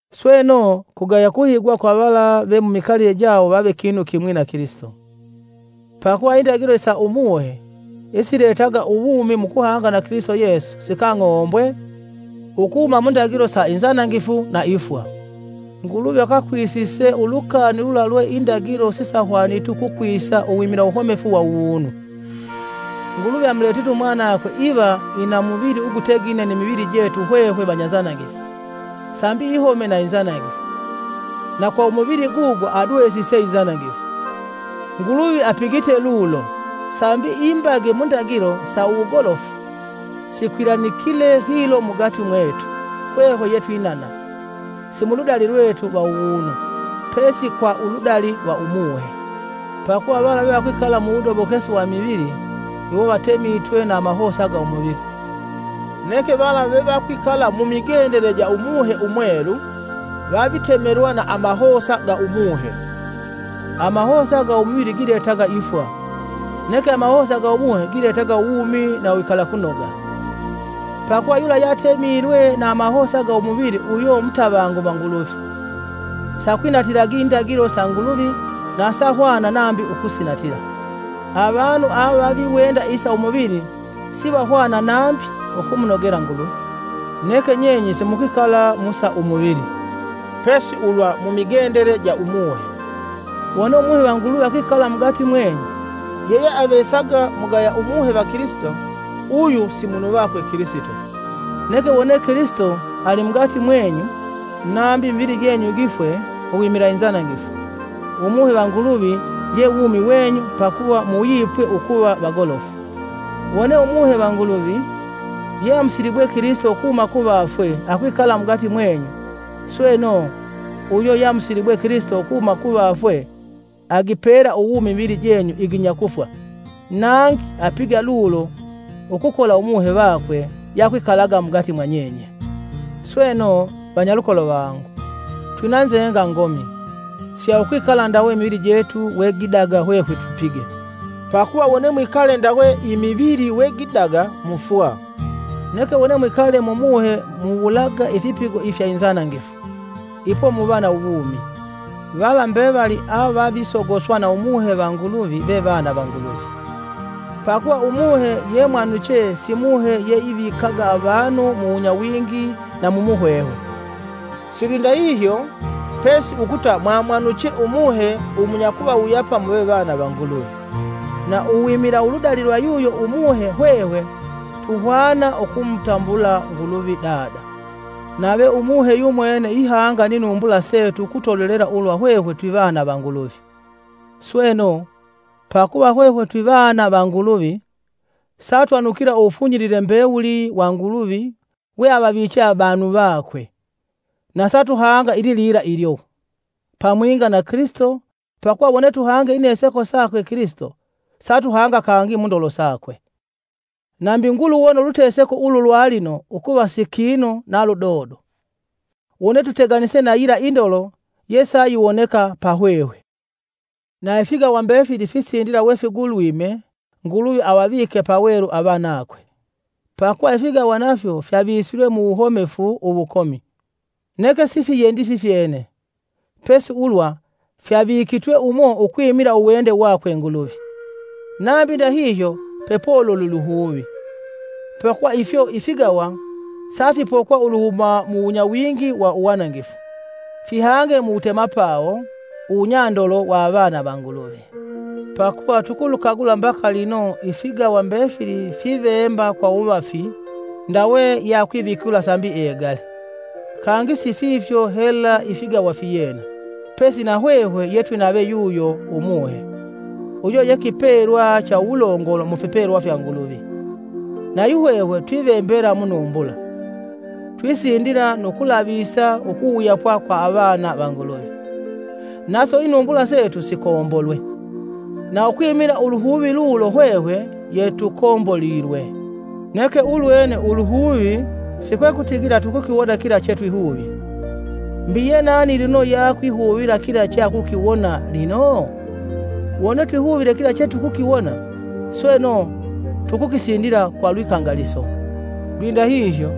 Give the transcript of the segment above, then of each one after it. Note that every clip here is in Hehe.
Sweno, kugaya kuhigwa kwa vala ve mumikalile jawo vave kinu kimwi na Kilisito. Pakuva indagilo isa Umuhe, isiletaga uwumi mu kuhanga na Kilisito Yesu sikang'ombwe ukuhuma mu ndagilo sa inzanangifu na ifwa. Nguluvi akakwisise ulukani lula lwe indagilo sisahwaniti ukukwisa uwimila uwuhomefu wa uwunu. Nguluvi amuletite umwanakwe iva ina muvili ugutegine ni mivili jetu hwehwe vanyanzanangifu, sambi ihome na inzanangifu, na kwa umuvili gugo adwesise inzanangifu. Nguluvi apigite lulo sambi imbage mu indagilo sa wugolofu sikwilanikile hilo mugati mwetu hwehwe yetwinana, si muludali lwetu lwa uwunu, pesi kwa uludali lwa Umuhe. Pakuva vala vevakwikala muwudobokesi wa imivili, iwo vatemitwe na amahosa ga umuvili. Neke vala vevakwikala mumigendele ja Umuhe Umwelu, vavitemelwa na amahosa ga Umuhe. Amahosa ga umuvili giletaga ifwa, neke amahosa ga Umuhe giletaga uwumi na uwikalakunoga. Pakuva yula yeatemilwe na amahosa ga umuvili uyo mutavangu va Nguluvi, siakwinatilagi indagilo sa Nguluvi na sahwana nambi ukusinatila. Avanu avaviwenda isa umuvili sivahwana nambi ukumunogela Nguluvi. Neke nyenye simukwikala mu sa umuvili, pesi ulwa mumigendele ja Umuhe, wone Umuhe va Nguluvi akwikala mugati mwenyu. Yeyeavesaga mugaya Umuhe va Kilisito, uyu si munu vakwe Kilisito. Neke wone Kilisito ali mugati mwenyu, nambi imivili jenyu gifwe uwimila inzanangifu, Umuhe va Nguluvi ye wumi wenyu pakuva muwuyipwe ukuva vagolofu. Wone Umuhe va Nguluvi, yeamusilibwe Kilisito ukuhuma kuvafwe akwikala mugati mwenyu, sweno uyo yeamusilibwe Kilisito ukuhuma kuvafwe agipela uwumi imivili jenyu iginya kufwa, nangi apiga lulo ukukola Umuhe vakwe yeakwikalaga mugati mwanyenye. Sweno, vanyalukolo vangu, twinanzenga ngomi, si ya ukwikala ndawe imivili jetu we gidaga hwehwe tupige. Pakuva wone mwikale ndawe imivili we gidaga, mufwa. Neke wone mwikale mu Muhe muwulaga ifipigo ifya inzanangifu, ipo muva na uwumi. Vala mbevali avavisogoswa na Umuhe va Nguluvi ve vana va Nguluvi. Pakuva Umuhe ye mwamwanuche si Muhe yeivikaga avanu mu wunyawingi na mu muhwehwe, silwindahihyo pesi ukuta mwamwanuche Umuhe umunyakuvawuyapa muve vana va Nguluvi, na uwimila uludali kwa yuyo Umuhe hwehwe tuhwana ukumutambula Nguluvi “Dada!” Nave Umuhe yumwene ihanga ni numbula setu ukutolelela ulwa hwehwe twivana va Nguluvi. Sweno, pakuva hwehwe twivana va Nguluvi, satwanukila uwufunyilile mbewuli wa Nguluvi weavaviche avanu vakwe, na satuhanga ililila ilyo, pamwinga na Kilisito pakuva wone tuhange ineseko sakwe Kilisito, satuhanga kangi mundolo sakwe. Nambi nguluwona uluteseko ulu lwalino ukuva si kinu na ludodo, wone tuteganise na yila indolo yesayiwoneka pa hwehwe. Na ifigawa mbefili fisindila kwa kuguluma Nguluvi avavike pawelu avanakwe. Pakuva ifigawa nafyo fyavisilwe mu wuhomefu uwukomi, neke sifiyendyi fifyene, pesi ulwa fyavikitwe umo ukwimila uwende wakwe Nguluvi. Nambi ndahihyo pepololi uluhuvi, pakuva ifyo ifigawa safipokwa uluhuma mu wunyawingi wa uwanangifu, vihange uwutemapawo uwunyandolo wa avana va Nguluvi. Pakuva tukulukagula mbaka lino ifigawa mbefili fivemba kwa uwuvafi ndawe yeakwivikula sambi egale. Kangi si fifyo hela ifigawa fiyena, pesi na hwehwe yetwinave yuyo Umuhe, uyo ye kipelwa cha uwulongolo mu fipelwa fya Nguluvi, nayuhwehwe twivembela munumbula, twisindila nu kulavisa ukuwuyapwa kwa avana va Nguluvi, naso inumbula setu sikombolwe. Na ukwimila uluhuvi lulo hwehwe yetukombolilwe, neke ulwene uluhuvi si kwekutigila tukukiwona kila chetwihuvye. Mbi yenani lino yeakwihuvila kila cheakukiwona lino? Wone twihuvile kila chesitulakiwona, sweno tukukisindila kwa lwikangaliso. Lwindahihyo,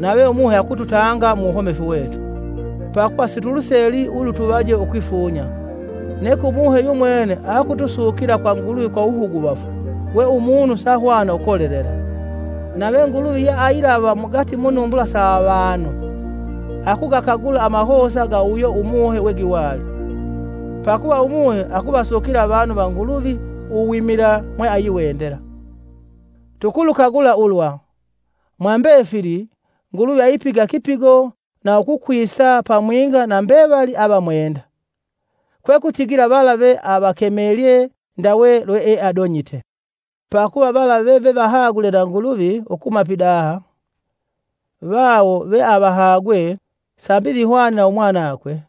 nave Umuhe akututanga mu wuhomefu wetu. Pakuva situluseli ulutuvaje ukwifunya, neke Umuhe yumwene akutusukila kwa Nguluvi kwa wuhuguvafu we umunu sahwana ukolelela. Nave Nguluvi yeailava mugati munumbula sa avanu, akugakagula amahosa ga uyo Umuhe wegiwali; pakuva Umuhe akuvasukila avanu va Nguluvi uwimila mweayiwendela. Tukulukagula ulwa, mwa mbefili, Nguluvi aipiga kipigo na ukukwisa pamwinga na mbevali avamwenda, kwe kutigila vala ve avakemelye, ndawe lweeadonyite. Pakuva vala vevevahagule na Nguluvi ukuhuma pidaha, vawo veavahagwe, sambi vihwane na umwanakwe,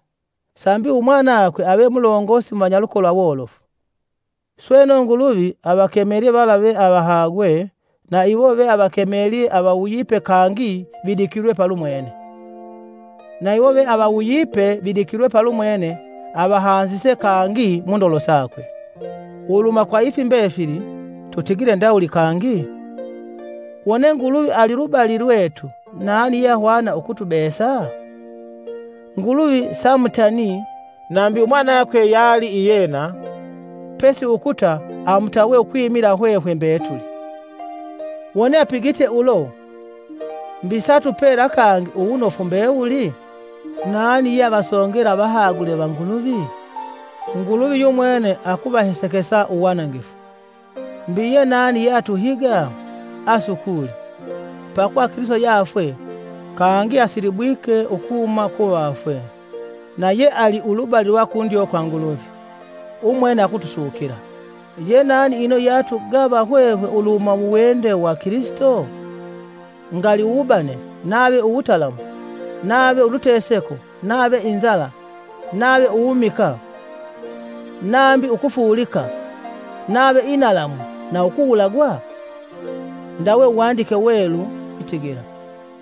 sambi umwanakwe ave mulongosi mu vanyalukolo awolofu. Sweno Nguluvi avakemelye vala veavahagwe na iwo veavakemelye avawuyipe kangi vidikilwe palumwene; na iwo veavawuyipe vidikilwe palumwene, avahanzise kangi mundolo sakwe. Uluhuma kwa ifi mbefili, tutigile ndawuli kangi? Wone Nguluvi ali lubali lwetu, nani yeahwana ukutubesa?. Nguluvi samutanii; nambi umwanakwe yali iyena, pesi ukuta amutawe ukwimila hwehwe mbetuli. Wone apigite ulo, mbi satupela kangi uwunofu mbewuli? Nani yeavasongela avahagule va Nguluvi? Nguluvi yumwene akuvahesekesa uwanangifu. Mbi ye nani yeatuhiga? Asukuli! Pakuva Kilisito yeafwe, kangi asilibwike ukuhuma kuvafwe nayeali ulubali lwa kundyo kwa Nguluvi. Umwene akutusukila. Ye nani ino yeatugava hwehwe uluhuma muwende wa Kilisito? Ngali uwubane nave uwutalamu, nave uluteseko nave inzala nave uwumikaa nambi ukufuulika, nave inalamu na ukuwulagwa? Ndawe Uwandike Uwelu witigila: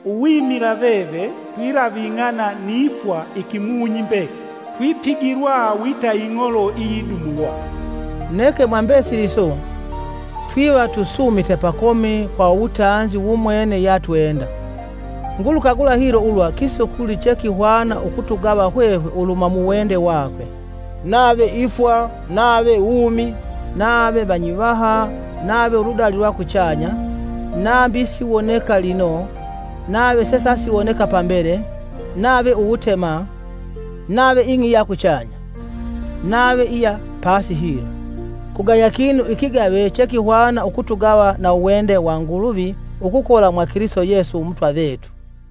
“Uwimila veve, twilaving'ana ni fwa ikimunyi mbekili; tupigilwa wita ing'olo iyidumulwa.” Neke, mwa mbesili iso, twiva tusuumite pakomi kwa uwutanzi wumwene yeatwenda. Ngulukagula hilo ulwa kisukuli chekihwana ukutugava hwehwe uluhuma muwende wakwe: nave ifwa nave wumi; nave vanyivaha nave uludali lwa kuchanya; nambi isiwoneka lino, nave sesasiwoneka pambele, nave uwutema, nave ing'i iya kuchanya, nave iya pasi hilo. Kugaya kinu ikigave chekihwana ukutugava na uwende wa Nguluvi ukukola mwa Kilisito Yesu Umutwa vetu.